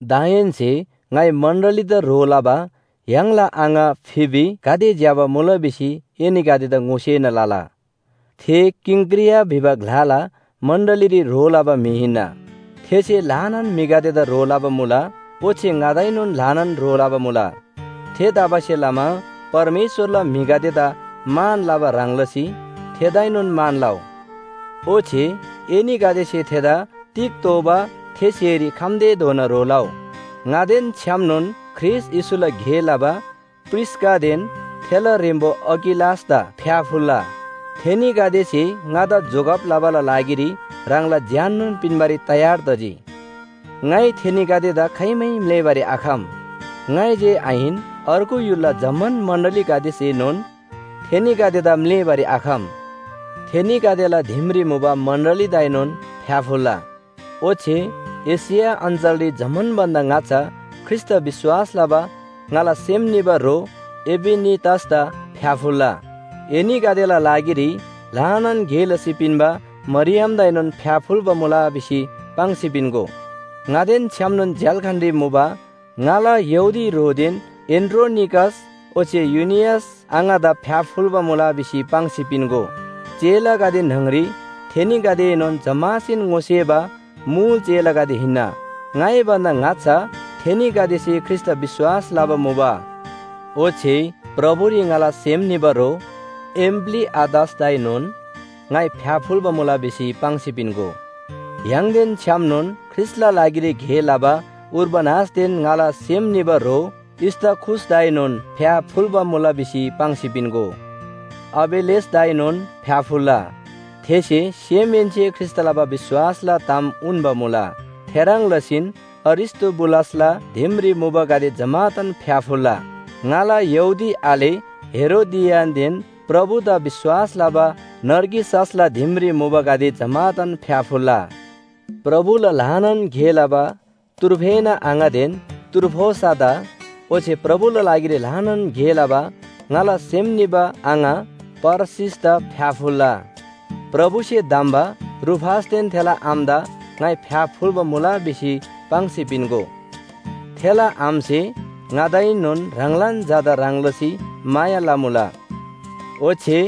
दाहेन्‍से ङाइ मण्‍डलीदा ह्रो लबा य्‍हाङला आङा फिबी गाते ज्‍यबा मुला भिसी एनीगदेदा ङोसेना लला। थे किंक्रिया भिबा ग्‍लाला मण्‍डलीरी ह्रो लबा म्‍हि हिन्‍ना। थेसे ल्‍हानान म्‍हिगदेदा ह्रो लबा मुला ओच्‍छे ङादाएनोन ल्‍हानान ह्रो लबा मुला। थेतबासेलमा परमेश्‍वरला म्‍हिगदेदा मान लबा ह्रङ् लसी थेदाएनोन मान लउ। ओच्‍छे एनीगदेसे थेदा तिग तोःबा थे स्‍हेरी खम्‍तेधोना ह्रो लउ। ङादेन छ्‌यामनोन ख्रीष्‍ट येशूला गे लबा प्रिस्‍कादेन थेला ह्रेम्‍बो अकिलासदा फ्‍याफुल्‍ला। थेनीगदेसे ङादा जोगब लबाला लागिरी ह्राङला ज्‍याननोन पिन्‍बारी तयार तजी। ङाइ थेनीगदेदा खाइमै म्‍लेःबारी आखम, ङाइ जे आहिन, अर्गु य्‍हुलला जम्‍मान मण्‍डलीगदेसेएनोन थेनीगदेदा म्‍लेःबारी आखम। थेनीगदेला दिमरी मुबा मण्‍डलीदाएनोन फ्‍याफुल्‍ला। ओच्‍छे एशिया अञ्‍चलरी जम्‍मान भन्‍दा ङाच्‍छा ख्रीष्‍टदा विश्‍वास लबा ङाला सेम निबा ह्रो इपेनितसदा फ्‍याफुल्‍ला। एनीगदेला लागिरी ल्‍हानान गे लसी पिन्‍बा मरियमदाएनोन फ्‍याफुल्‍बा मुला भिसी पाङ्सी पिन्‍गो। ङादेन छ्‌यामनोन झ्‍याल्‍खानरी मुबा ङाला यहूदी ह्रोदेन एन्‍ड्रोनिकस ओच्‍छे युनियस आङादा फ्‍याफुल्‍बा मुला भिसी पाङ्सी पिन्‍गो। चेलागदे न्‍हङरी थेनीगदेएनोन जम्‍मासेन ङोसेबा मुल चेलागदे हिन्‍ना। ङाइ भन्‍दा ङाच्‍छा थेनीगदेसे ख्रीष्‍टदा विश्‍वास लबा मुबा। ओच्‍छे प्रभुरी ङाला सेम निबा ह्रो एम्‍प्‍लीआतसदाएनोन ङाइ फ्‍याफुल्‍बा मुला भिसी पाङ्सी पिन्‍गो। य्‍हाङदेन छ्‌यामनोन ख्रीष्‍टला लागिरी गे लबा उर्बानसदेन ङाला सेम निबा ह्रो स्‍ताखुसदाएनोन फ्‍याफुल्‍बा मुला भिसी पाङ्सी पिन्‍गो। अपेल्‍लेसदाएनोन फ्‍याफुल्‍ला। थेसे सेमहेन्‍से ख्रीष्‍टदा लबा विश्‍वासला ताम उन्‍बा मुला। थेह्रङ् लसीन अरिस्‍तोबुलसला दिमरी मुबागदे जम्‍मादान फ्‍याफुल्‍ला। ङाला यहूदी आले हेरोदियनदेन प्रभुदा विश्‍वास लबा नर्किससला दिमरी मुबागदे जम्‍मादान फ्‍याफुल्‍ला। प्रभुला ल्‍हानान गे लबा त्रुफेना आङादेन त्रुफोसादा ओच्‍छे प्रभुला लागिरी ल्‍हानान गे लबा ङाला सेम निबा आङा परसीसदा फ्‍याफुल्‍ला। प्रभुसे धम्‍बा रूफसदेन थेला आमादा ङाइ फ्‍याफुल्‍बा मुला भिसी पाङ्सी पिन्‍गो। थेला आमासे ङादाएनोन ह्राङलान झादा ह्रङ् लसी माया लमुला। ओच्‍छे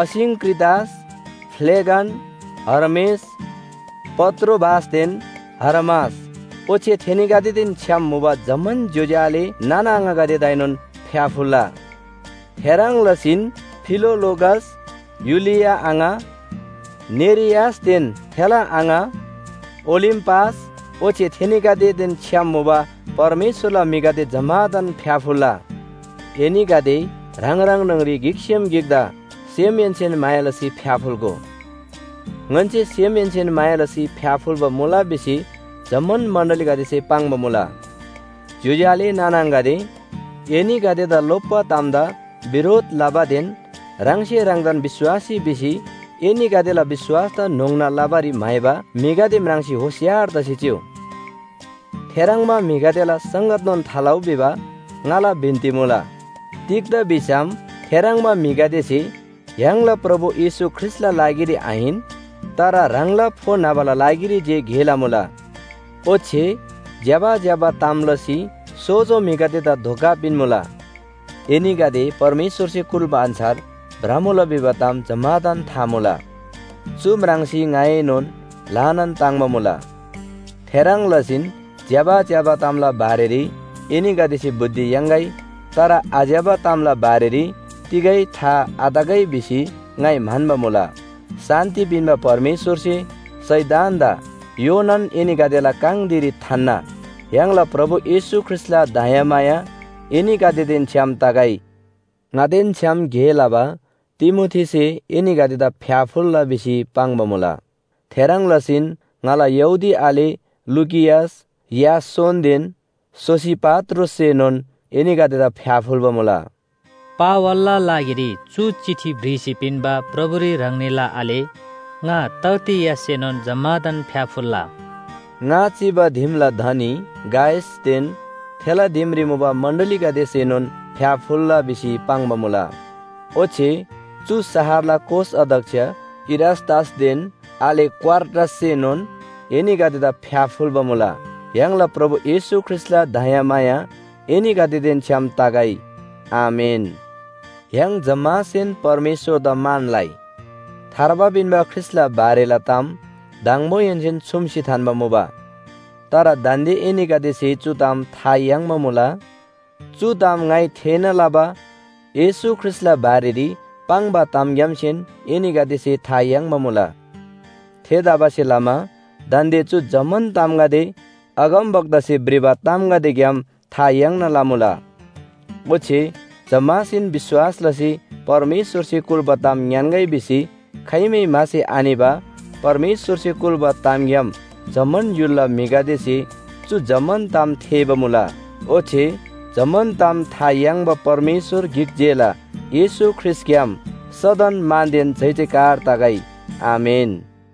असिंक्रितस, फ्‍लेगन, हर्मेस, पत्रोबासदेन हर्मास ओच्‍छे थेनीगदेदेन छ्‌याम मुबा जम्‍मान ज्‍योज्‍यो आले नाना आङागदेदाएनोन फ्‍याफुल्‍ला। थेह्रङ् लसीन फिलोलोगस, युलिया आङा, नेरियसदेन थेला आङा, ओलिम्‍पास ओच्‍छे थेनीगदेदेन छ्‌याम मुबा परमेश्‍वरला म्‍हिगदे जम्‍मादान फ्‍याफुल्‍ला। एनीगदे ह्राङ ह्राङ न्‍हङरी गिकसेम गिकदा सेमहेन्‍सेन माया लसी फ्‍याफुल्‍गो। ङन्‍से सेमहेन्‍सेन माया लसी फ्‍याफुल्‍बा मुला भिसी जम्‍मान मण्‍डलीगदेसे पाङ्बा मुला। ज्‍योज्‍यो आले नाना आङागदे, एनीगदेदा लोप्‍बा तामदा बिरोध लबादेन ह्राङसे ह्राङदान विश्‍वासी भिसी एनीगदेला विश्‍वासदा न्‍होङ्ना लबारी म्‍हाइबा म्‍हिगदे म्राङ्सी होशियार तसी चिउ। थेह्रङ्बा म्‍हिगदेला संगतनोन थालउ भिबा ङाला बिन्‍ती मुला। तिग्‍दा भिसम थेह्रङ्बा म्‍हिगदेसे य्‍हाङला प्रभु येशू ख्रीष्‍टला लागिरी आहिन, तर ह्राङला फो न्‍हबाला लागिरी जे गे लमुला। ओच्‍छे ज्‍यबा ज्‍यबा ताम लसी सोजो म्‍हिगदेदा धोका पिन्‍मुला। एनीगदे परमेश्‍वरसे कुल्‍बा अन्‍छार भ्रमुला भिबा ताम जम्‍मादान था मुला। चु म्राङ्सी ङाएनोन ल्‍हानान ताङ्‍बा मुला। थेह्रङ् लसीन ज्‍यबा ज्‍यबा तामला बारेरी एनीगदेसे बुद्धि याङ्‌गै तर आज्‍यबा तामला बारेरी तिगै था आतगै भिसी ङाइ म्‍हन्‍बा मुला। शान्‍ति पिन्‍बा परमेश्‍वरसे शैतानदा योनान एनीगदेला काङ धिरी थान्‍ना। य्‍हाङला प्रभु येशू ख्रीष्‍टला दयामाया एनीगदेदेन छ्‌याम तगै। ङादेन छ्‌याम गे लबा तिमोथीसे एनीगदेदा फ्‍याफुल्‍ला भिसी पाङ्बा मुला। थेह्रङ् लसीन ङाला यहूदी आले लुकियस, यासोनदेन सोसिपात्रोससेनोन एनीगदेदा फ्‍याफुल्‍बा मुला। पावलला लागिरी चु चिठी भ्रिसी पिन्‍बा प्रभुरी ह्राङनीला आले ङा तर्तियससेनोन जम्‍मादान फ्‍याफुल्‍ला। ङा चिबा दिमला धनी गायसदेन थेला दिमरी मुबा मण्‍डलीगदेसेनोन फ्‍याफुल्‍ला भिसी पाङ्बा मुला। ओच्‍छे चु शहरला कोष अध्‍यक्ष इरास्‍तसदेन आले क्‍वार्टससेनोन एनीगदेदा फ्‍याफुल्‍बा मुला। य्‍हाङला प्रभु येशू ख्रीष्‍टला दयामाया एनीगदेदेन छ्‌याम तगै। आमेन। य्‍हाङ जम्‍मासेन परमेश्‍वरदा मान लइ। थार्बा पिन्‍बा ख्रीष्‍टला बारेला ताम दङबोहेन्‍सेन छुम्‍सी थान्‍बा मुबा। तर दान्‍दे एनीगदेसे चु ताम था याङ्बा मुला। चु ताम ङाइ थेःना लबा येशू ख्रीष्‍टला बारेरी पाङ्बा तामग्‍यामसे एनीगदेसे था याङ्बा मुला। थेतबासेलमा दान्‍दे चु जम्‍मान तामगदे अगमवक्तासे भ्रिबा तामगदेग्‍याम था याङ्ना लमुला। ओच्‍छे जम्‍मासेन विश्‍वास लसी परमेश्‍वरसे कुल्‍बा ताम ङ्‌यान्‍गै भिसी खाइमै म्‍हासी आनिबा परमेश्‍वरसे कुल्‍बा तामग्‍याम जम्‍मान य्‍हुलला म्‍हिगदेसे चु जम्‍मान ताम थेःबा मुला। ओच्‍छे जम्‍मान ताम था याङ्बा परमेश्‍वर गिक जेला येशू ख्रीष्‍टग्‍याम सदन मानदेन जयजयकार तगै। आमेन।